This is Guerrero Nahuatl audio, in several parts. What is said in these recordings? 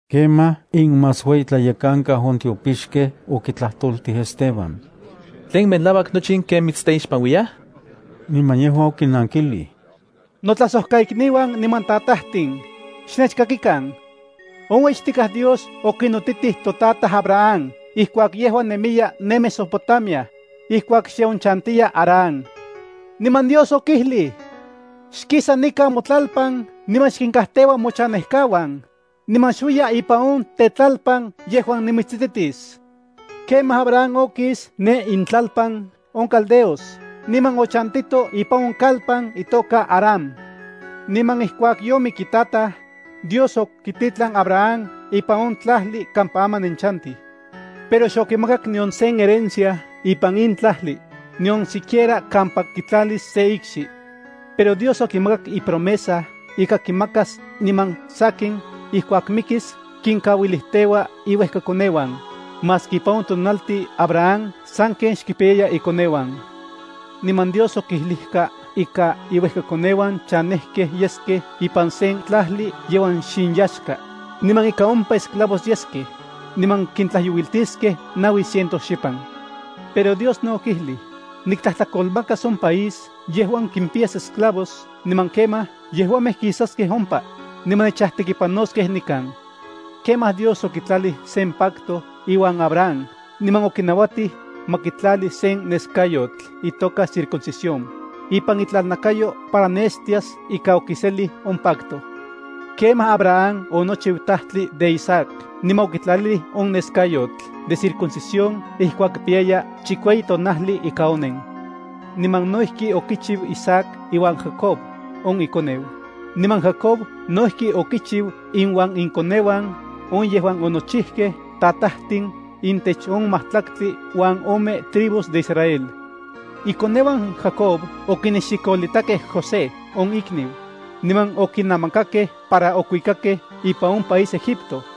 Kemaj inmasueyitlayekankau on tiopixkej okitlajtoltij Esteban: —¿Tlen melauak nochi in ken mitsteixpanuiyaj? Niman yejua okinankilij: —Notlajsojkaikniuan niman tatajtin, xnechkakikan. On ueyixtikaj Dios okinotitij totataj Abraham ijkuak yejua nemiya ne Mesopotamia, ijkuak xe onchantiya Harán. Niman Dios okijlij: “Xkisa nikan motlalpan niman xkinkajteua mochanejkauan, niman xuiya ipan on tetlalpan yejuan nimitsititis.” Kemaj Abraham okis ne intlalpan on caldeos niman ochantito ipan on kalpan itoka Harán. Niman ijkuak yomik itataj, Dios okititlan Abraham ipan in tlajli kampa aman nenchantij. Pero xokimakak nion sen herencia ipan in tlajli, nion siquiera kampa kitlalis sen ikxi. Pero Dios okimakak ipromesa ika kimakas, niman sankin ijkuak mikis kinkauilijteua iuejkakoneuan, maski ipan on tonaltin Abraham sanken xkimpiyaya ikoneuan. Niman Dios okijlijka ika iuejkakoneuan chanejkej yeskej ipan sen tlajli yejuan xinyaxka, niman ika ompa esclavos yeskej, niman kintlajyouiltiskej naui ciento xipan. Pero Dios no okijlij: “Niktlajtlakolmakas on país yejuan kimpiyas esclavos niman kemaj yejuamej kisaskej ompa, niman nechajtekipanoskej nikan.” Kemaj Dios okitlalij sen pacto iuan Abraham niman okinauatij ma kitlali sen neskayotl, itoka circuncisión, ipan itlalnakayo para nestias ika okiselij on pacto. Kemaj Abraham onochiu tajtli de Isaac niman okitlalilij on neskayotl de circuncisión ijkuak kipiyaya chikueyi tonajli ika onen. Niman no ijki okichiu Isaac iuan Jacob on ikoneu, niman Jacob no ijki okichiu inuan ikoneuan on yejuan onochijkej tatajtin intech on majtlaktli uan ome tribus de Israel. ’Ikoneuan Jacob okinexikolitakej José on imikniu, niman okinamakakej para okuikakej ipan on país Egipto.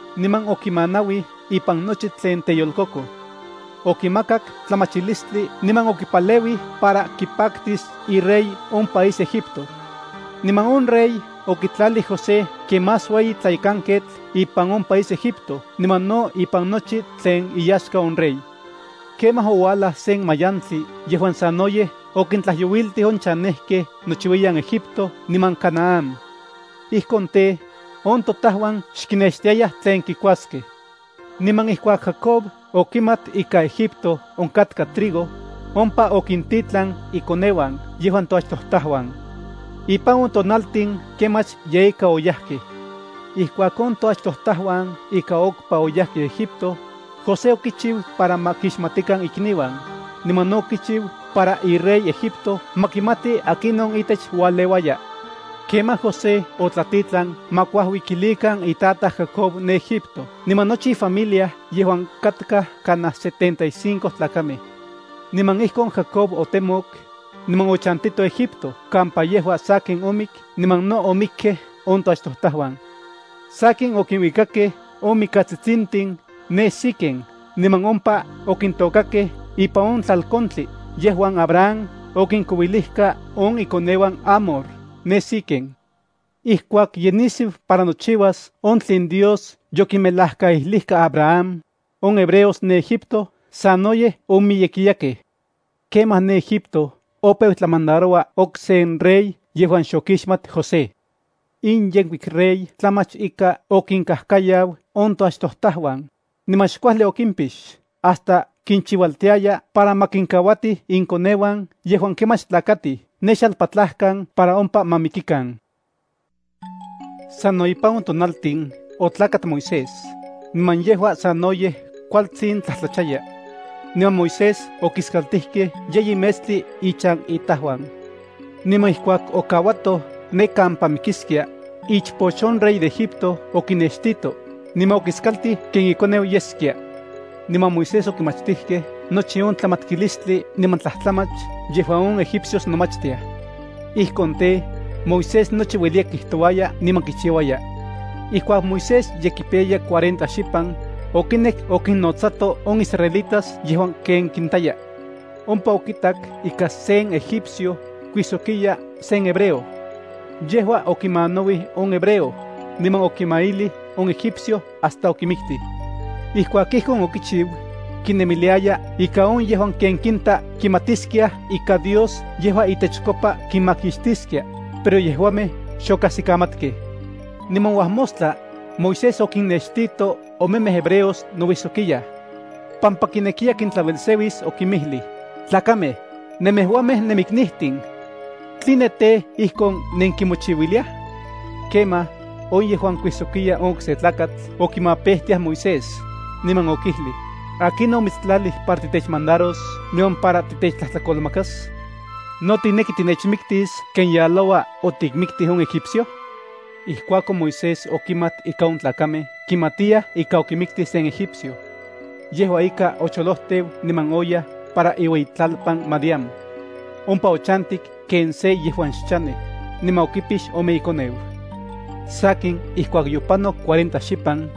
niman okimanauij ipan nochi tlen teyolkokoj. Okimakak tlamachilistli niman okipaleuij para kipaktis irey on país Egipto. Niman on rey okitlalij José ken más ueyi tlayekanketl ipan on país Egipto niman no ipan nochi tlen iyaxka on rey. ’Kemaj ouajlaj sen mayantli yejuan sanoyej okintlajyouiltij on chanejkej nochiuiyan Egipto niman Canaán. Ijkon tej, on totajuan xkinextiayaj tlen kikuaskej. Niman ijkuak Jacob okimat ika Egipto onkatka trigo, ompa okintitlan ikoneuan yejuan toachtojtajuan. Ipan on tonaltin kemach yeika oyajkej. Ijkuak on toachtojtajuan ika okpa oyajkej Egipto, José okichiu para ma kixmatikan ikniuan, niman no okichiu para irey Egipto ma kimati akinon itech ualeuaya. Kemaj José otlatitlan ma kuajuikilikan itataj Jacob ne Egipto niman nochi ifamilia yejuan katkaj kanaj setenta y cinco tlakamej. Niman ijkon Jacob otemok, niman ochantito Egipto kampa yejua sakin omik niman no omikkej on toachtojtajuan. Sakin okinuikakej on mikatsitsintin ne Siquem niman ompa okintôkakej ipan on tlalkontli yejuan Abraham okinkouilijka on ikoneuan Hamor ne Siquem. ’Ijkuak ye nisiu para nochiuas on tlen Dios yokimelajkaijlijka Abraham, on hebreos ne Egipto sanoyej omiyekiyakej. Kemaj ne Egipto opeu tlamandaroua oksen rey yejuan xokixmat José. In yenkuik rey tlamach ika okinkajkayau on toachtojtajuan, niman xkuajli okimpix hasta kinchiualtiaya para ma kinkauatij inkoneuan yejuan kemach tlakatij ne xalpatlajkan para ompa ma mikikan. Sano ipan on tonaltin otlakat Moisés, niman yejua sanoyej kualtsin tlajtlachaya. Niman Moisés okiskaltijkej yeyi metstli ichan itajuan. Niman ijkuak okauatoj ne kampa mikiskia, ichpoch on rey de Egipto okinextito, niman okiskaltij ken ikoneu yeskia. Niman Moisés okimachtijkej nochi on tlamatkilistli niman tlajtlamach yejuan on egipcios nomachtiaj. Ijkon tej, Moisés nochi ueliya kijtouaya niman kichiuaya. ’Ijkuak Moisés ye kipiyaya cuarenta xipan, okinek okinnotsato on israelitas yejuan ken kintaya. Ompa okitak ika sen egipcio kuijsokiya sen hebreo. Yejua okimanauij on hebreo, niman okimailij on egipcio hasta okimiktij. Ijkuak ijkon okichiu, kinemiliaya ika on yejuan ken kinta kimatiskiaj ika Dios yejua itechkopa kinmakixtiskia, pero yejuamej xokajsikamatkej. Niman uajmostla, Moisés okinnextito omemej hebreos nouijsokiyaj. Pampa kinekiya kintlauelseuis, okinmijlij: “Tlakamej, nemejuamej nemiknijtin. ¿Tline tej, ijkon nenkimochiuiliaj?” ’Kemaj, on yejuan kuijsokia on okse tlakatl okimapejtiaj Moisés, niman okijlij: “¿Akinon omitstlalij para titechmandaros niman para titechtlajtlakolmakas? ¿No tikneki tinechmiktis ken yaloua otikmiktij on egipcio?” Ijkuakon Moisés okimat ika on tlakamej kimatiyaj ika okimiktij sen egipcio. Yejua ika, ocholojteu niman oyaj para iueyitlalpan Madián. Ompa ochantik ken se yejuan xchanej, niman okipix ome ikoneu. ’Sakin ijkuak yopanok cuarenta xipan,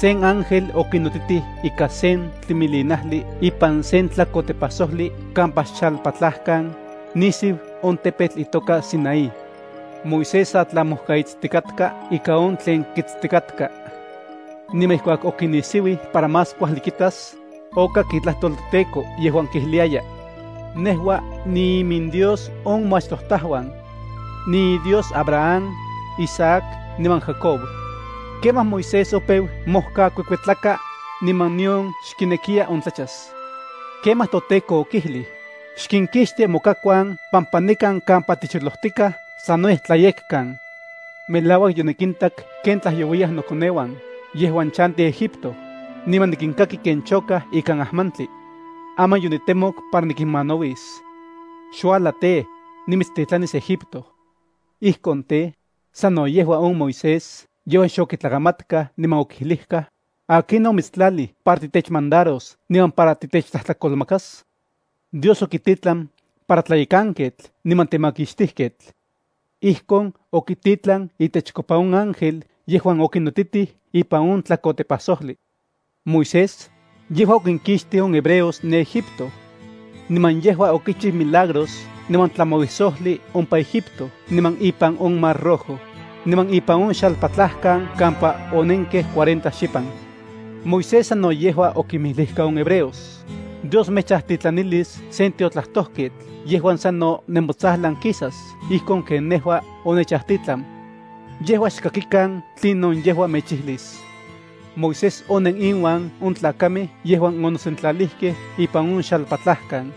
sen ángel okinotitij ikan sen tlimilinajli ipan sen tlakotepajsojli kampa xalpatlajkan, nisiu on tepetl itoka Sinaí. Moisés sa tlamojkaitstikatka ika on tlen kitstikatka. Niman ijkuak okinisiuij para más kuajli kitas, okak itlajtol toTEKO yejuan kijliayaj: “Nejua niiminDios on moachtojtajuan. NiiDios Abraham, Isaac niman Jacob.” Kemaj Moisés opeu mojkakuekuetlaka, niman nion xkinekiya ontlachas. Kemaj toTEKO okijlij: “Xkinkixti mokakuan pampa nikan kampa ticholojtikaj sanoyej tlayekkan. Melauak yonikintak ken tlajyouiyaj nokoneuan yejuan chantij Egipto, niman nikinkaki ken chokaj ikan ajmantli. Aman yonitemok para nikinmanauis. Xuajla tej, nimitstitlanis Egipto.” Ijkon tej, sano yejua on Moisés yejuan xokitlakamatkaj niman okijlijkaj: “¿Akinon omitstlalij para titechmandaros niman para titechtlajtlakolmakas?” Dios okititlan para tlayekanketl niman temakixtijketl. Ijkon, okititlan itechkopa on ángel yejuan okinotitij ipan on tlakotepajsojli. Moisés, yejua okinkixtij on hebreos ne Egipto. Niman yejua okichiu milagros niman tlamauisojli ompa Egipto niman ipan on mar Rojo, niman ipan on xalpatlajkan kampa onenkej cuarenta xipan. Moisés sano yejua okinmijlijka on hebreos: “Dios mechajtitlanilis sen tiotlajtojketl yejuan sano nemotsajlan kisas ijkon ken nejua onechajtitlan. Yejua xkakikan tlinon yejua mechijlis.” Moisés onen inuan on tlakamej yejuan onosentlalijkej ipan on xalpatlajkan.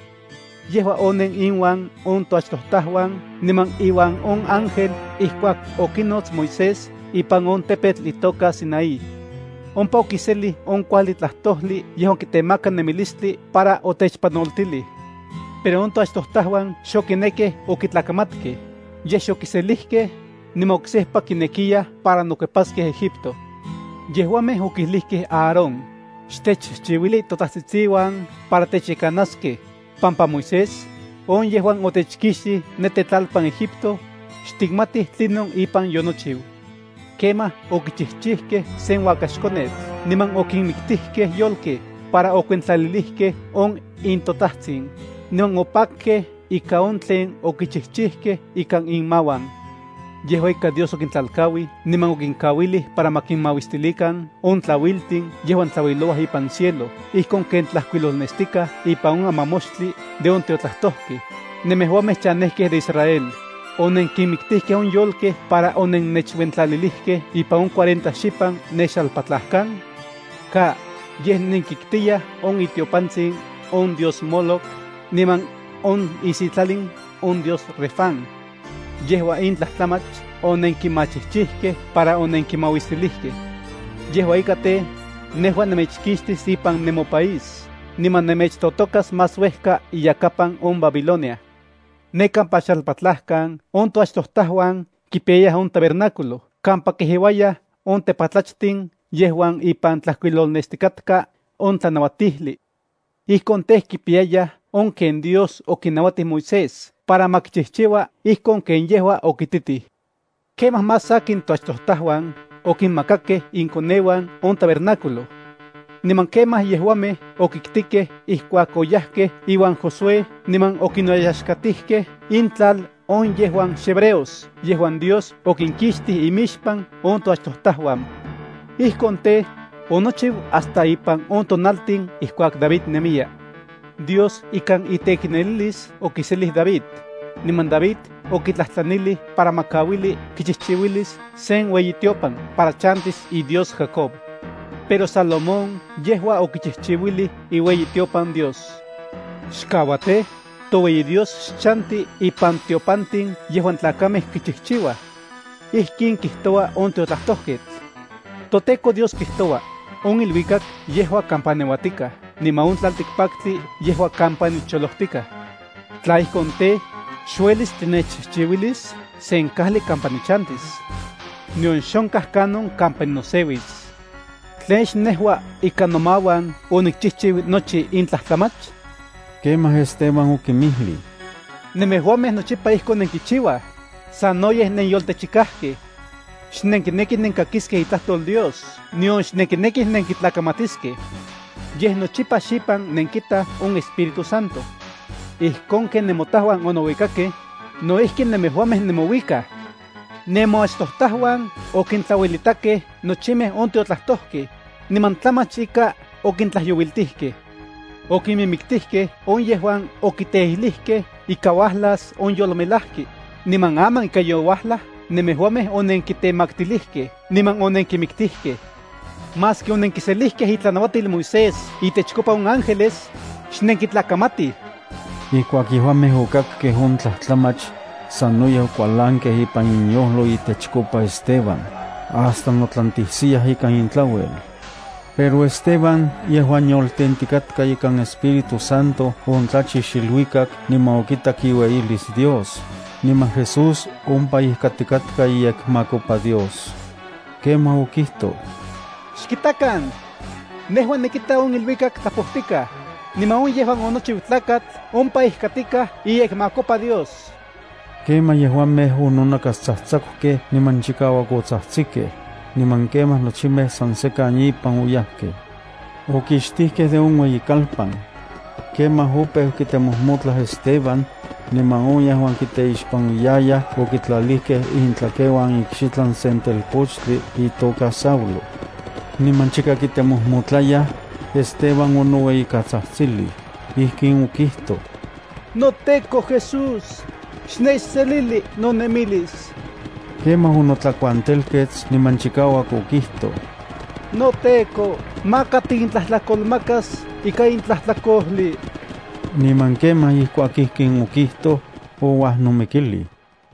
Yejua onen inuan on toachtojtajuan niman iuan on ángel ijkuak okinots Moisés ipan on tepetl itoka Sinaí. Ompa okiselij on kuajli tlajtojli yejuan kitemaka nemilistli para otechpanoltilij. ’Pero on toachtojtajuan xokinekkej okitlakamatkej, yej xokiselijkej, niman oksejpa kinekiyaj para nokuepaskej Egipto. Yejuamej okijlijkej Aarón: “Xtechchijchiuili totajtsitsiuan para techyekanaskej, pampa Moisés, on yejuan otechkixtij ne tetlalpan Egipto, xtikmatij tlinon ipan yonochiu.” Kemaj okichijchijkej sen uakaxkonetl niman okinmiktijkej yolkej para okuentlalilijkej on intotajtsin, niman opakkej ika on tlen okichijchijkej ikan inmauan. Yejua ika Dios okintlalkauij niman okinkauilij para ma kinmauistilikan on tlauiltin yejuan tlauilouaj ipan cielo ijkon ken tlajkuilolnestikaj ipan on amamoxtli de on tiotlajtojkej: Nemejuamej chanejkej de Israel, ¿onenkinmiktijkej on yolkej para onennechuentlalilijkej ipan on cuarenta xipan ne xalpatlajkan? Ka. Yej nenkiktiyaj on itiopantsin on dios Moloc niman on isitlalin on dios Refán. Yejua in tlajtlamach onenkinmachijchijkej para onenkinmauistilijkej. Yejua ika tej, nejua nemechkixtis ipan nemopaís niman nemechtotokas más uejka iyakapan on Babilonia. ’Ne kampa xalpatlajkan on toachtojtajuan kipiyayaj on tabernáculo kampa kejeuayaj on tepatlachtin yejuan ipan tlajkuilolnestikatka on tlanauatijli. Ijkon tej, kipiyayaj on ken Dios okinauatij Moisés para ma kichijchiua ijkon ken yejua okititij. Kemaj más sakin toachtojtajuan okinmakakej inkoneuan on tabernáculo. Niman kemaj yejuamej okitkikej ijkuak oyajkej iuan Josué niman okinoyaxkatijkej intlal on yejuan xhebreos yejuan Dios okinkixtij imixpan on toachtojtajuan. Ijkon tej, onochiu hasta ipan on tonaltin ijkuak David nemiya. Dios ikan iteiknelilis okiselij David, niman David okitlajtlanilij para ma kauili kichijchiuilis sen ueyitiopan para chantis iDios Jacob. Pero Salomón yejua okichijchiuilij iueyitiopan Dios. Xkaua tej, toueyi Dios xchanti ipan tiopantin yejuan tlakamej kichijchiuaj. Ijkin kijtoua on tiotlajtojketl: ToTEKO Dios kijtoua: “On iluikak yejua kampa neuatikaj, niman on tlaltikpaktli yejua kampa nicholojtikaj. Tla ijkon tej, xuelis tinechchijchiuilis sen kajli kampa nichantis. Nion xonkaj kanon kampa ninoseuis. ¿Tlen xnejua ikan nomauan onikchijchiu nochi in tlajtlamach?” Kemaj Esteban okinmijlij: —Nemejuamej nochipa ijkon nenkichiuaj, sanoyej nenyoltechikajkej. Xnenkinekij nenkakiskej itlajtol Dios nion xnenkinekij nenkitlakamatiskej. Yej nochipa xipan nenkitaj on Espíritu Santo. Ijkon ken nemotajuan onouikakej, no ijki nemejuamej nemouikaj. Nemoachtojtajuan nochimej on tiotlajtojkej, niman tlamach ika okintlajyouiltijkej. Okinmimiktijkej on yejuan okiteijlijkej ika uajlas on yolmelajki, niman aman ika youajlaj nemejuamej onenkitemaktilijkej niman onenkimiktijkej. Maski onenkiselijkej itlanauatil Moisés intechkopa on ángeles, xnenkitlakamatij. Ijkuak yejuamej okakkej on tlajtlamach, sanoyej okualankej ipan inyojlo itechkopa Esteban, hasta notlantisiyaj ikan intlauel. Pero Esteban yejuan yoltentikatka ikan Espíritu Santo ontlachix iluikak niman okitak iueyilis Dios, niman Jesús ompa ijkatikatka iyekmakopa Dios. Kemaj okijtoj: —¡Xkitakan! Nejua nikita on iluikak tlapojtikaj, niman on yejuan onochiu Tlakatl ompa ijkatikaj iyekmakopa Dios. Kemaj yejuamej ononakastsajtsakukej niman chikauak otsajtsikej niman kemaj nochimej san sekan ipan oyajkej. Okixtijkej de on ueyikalpan. Kemaj opeu kitemojmotlaj Esteban, niman on yejuan kiteixpanuiyayaj okitlalijkej intlakeuan ikxitlan sen telpochtli itoka Saulo. Niman chika kitemojmotlayaj, Esteban onoueyikatsajtsilij. Ijkin okijtoj: —NoTEKO Jesús, xnechselili nonemilis. Kemaj onotlakuantelkets niman chikauak otsajtsik: —NoTEKO, maka tikintlajtlakolmakas ika in tlajtlakojli. Niman kemaj ijkuak ijkin okijtoj, ouajnomikilij.